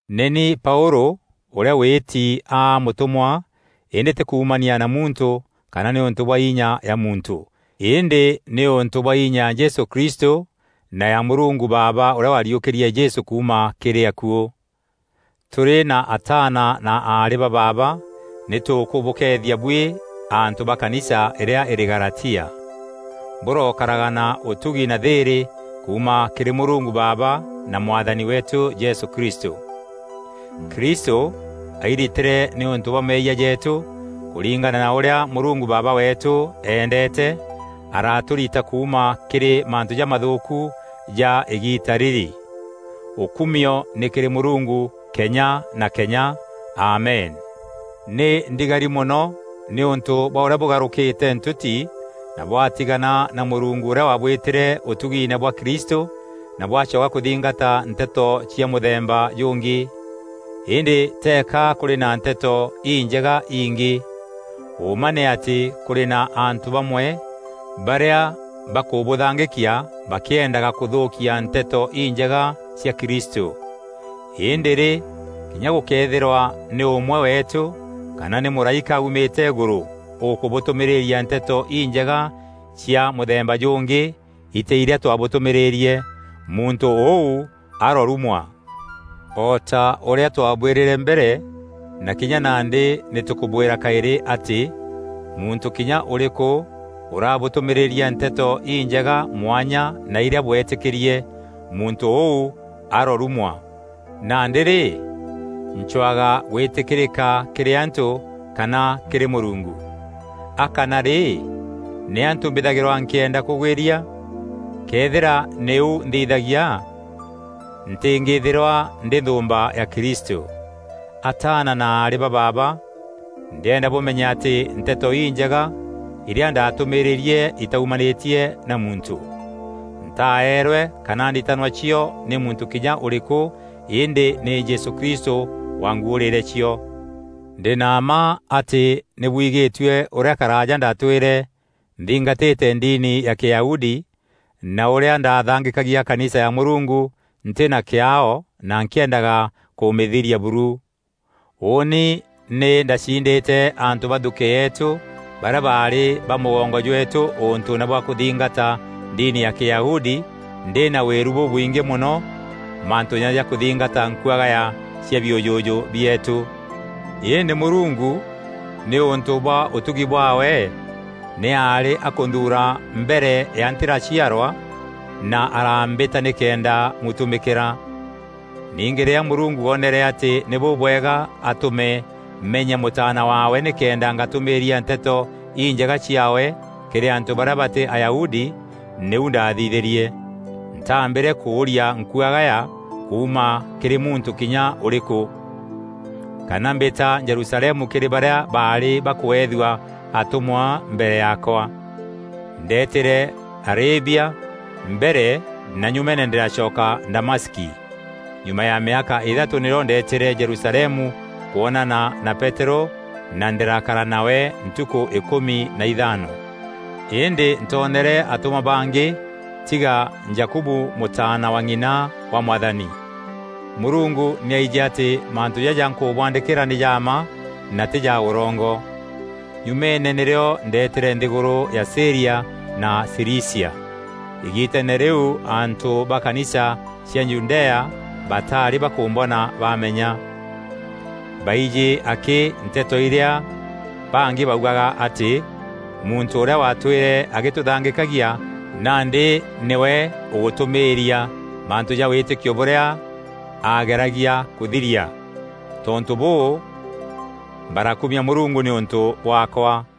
Nî ni Paûlû ûrîa wîti aa mûtûmwa îndî tî kuumania na muntû kana nîûntû bwa inya ya muntû, îndî nîûntû bwa inya ya Jesû Kristû na ya Mûrungu Baaba ûrîa wariûkîrie Jesû kuuma kîrî akuû. Tûrî na ataana na aarî ba baaba nî tûkûbûkeethia buî antû ba kanisa irîa irî Galatia. Bûrokaraga na ûtugi na thîîrî kuuma kîrî Mûrungu Baaba na Mwathani weetû Jesû Kristû. Kristû airitîre nîûntû bwa meeyia jeetû kûringana na ûrîa Mûrungu Baaba weetû eendeete, aratûrita kuuma kîrî mantû jamathûûku ja îgiita rîrî. Ûkûmio nî kîrî Mûrungu kenya na kenya! Amen. Nî ndigari mono nîûntû bwa ûrîa bûgarûkîte ntûti na bwaatigana na Mûrungu ûrîa waabwîtîre ûtugiine bwa Kristû na bwacoka kûthingata nteto cia mûthemba jûngî. Îndî teeka kûrî na Nteto Injega ingî. Ûûma nî atî kûrî na antû bamwe barîa bakûbûthangîkia bakîendaga kûthûûkia Nteto Injega cia Kristû. Îndî rî, kinya gûkëethîrwa nî ûmwe weetû kana nî mûraîka aumîte îgûrû ûkûbûtûmîrîria Nteto Injega cia mûthemba jûngî itî irîa twabûtûmîîrîrie, muntû ûu arorumwa! O ta ûrîa twaabwîrîre mbere, na kinya nandî nî tûkûbwîra kaîrî atî: muntû kinya ûrîkû ûrabûtûmîrîria Nteto Injega mwanya na irîa bweetîkîrie, muntû ûu arorumwa! Nandî rî, ncwaga gwîtîkîrîka kîrî antû kana kîrî Mûrungu? A kana rî, nî antû mbîthagîrwa nkîenda kûgwîria? Këethîra nî ûu nthithagia, ntîngîthîrwa ndî nthûûmba ya Kristû. Ataana na aarî ba baaba, ndîenda bûmenye atî Nteto Injega irîa ndaatûmîrîîrie itaumanîtie na muntû. Ntaeerwe kana nditanwa cio nî muntû kinya ûrîkû îndî nî Jesû Kristû waanguûrîîre cio. Ndî na mma atî nî bwigîtue ûrîa karaaja ndaatwîre nthingatîte ndini ya Kîyahudi, na ûrîa ndaathangîkagia kanisa ya Mûrungu ntî na kîaao na nkîendaga kûmîthiria buru. Ûûni nî ndaciindîte antû ba nthukî yeetû barîa baarî ba mûgongo jweetû ûntûûne bwa kûthingata ndini ya Kîyahudi, ndî na wîru bûbwingî mono mantûûne ja kûthingata nkuagaya cia biûjûjû bieetû. Îndî Mûrungu, nîûntû bwa ûtugi bwaawe, nî aarî akûnthuura mbere ya ntîraciarwa na arambîta nîkenda mûtumîkîra. Ningî rîrîa Mûrungu oonere atî nî bûbwega atûme menye Mûtaana waawe nîkenda ngatûmîîria Nteto Injega ciaawe kîrî antû barîa batî Ayahudi, nîu ndaathithîrie. Ntaambîre kûûria nkuagaya kuuma kîrî muntû kinya ûrîkû, kana mbîta Jerusalemu kîrî barîa baarî bakweethua atûmwa mbere yaakwa. Ndeetîre Arabia mbere na nyumeene ndîracoka Damaski. Nyuma ya mîaka îthatû nîrîo ndeetîre Jerusalemu kwonana na Peterû na ndîrakara nawe ntukû îkûmi na ithaano. Îndî ntoonere atûmwa bangî tiga Jakubu mûtaana wa ng'ina wa Mwathani. Mûrungu nî aijî atî mantû jaja nkûbwaandîkîra nî ja mma na tî ja ûrongo. Nyumeene nîrîo ndeetîre nthîgûrû ya Sîria na Cilicia. Îgiteene rîu, antû ba kanisa cia Judea bataarî bakûmbona baameenya. Baijî akî nteto irîa bangî baugaga, atî: “Muntû ûrîa waatwîre agîtûthangîkagia, nandî nîwe ûgûtûmîîria mantû ja wîtîkio bûrîa aageragia kûthiria!” Tontû bûû, barakumia Mûrungu nîûntû bwaakwa.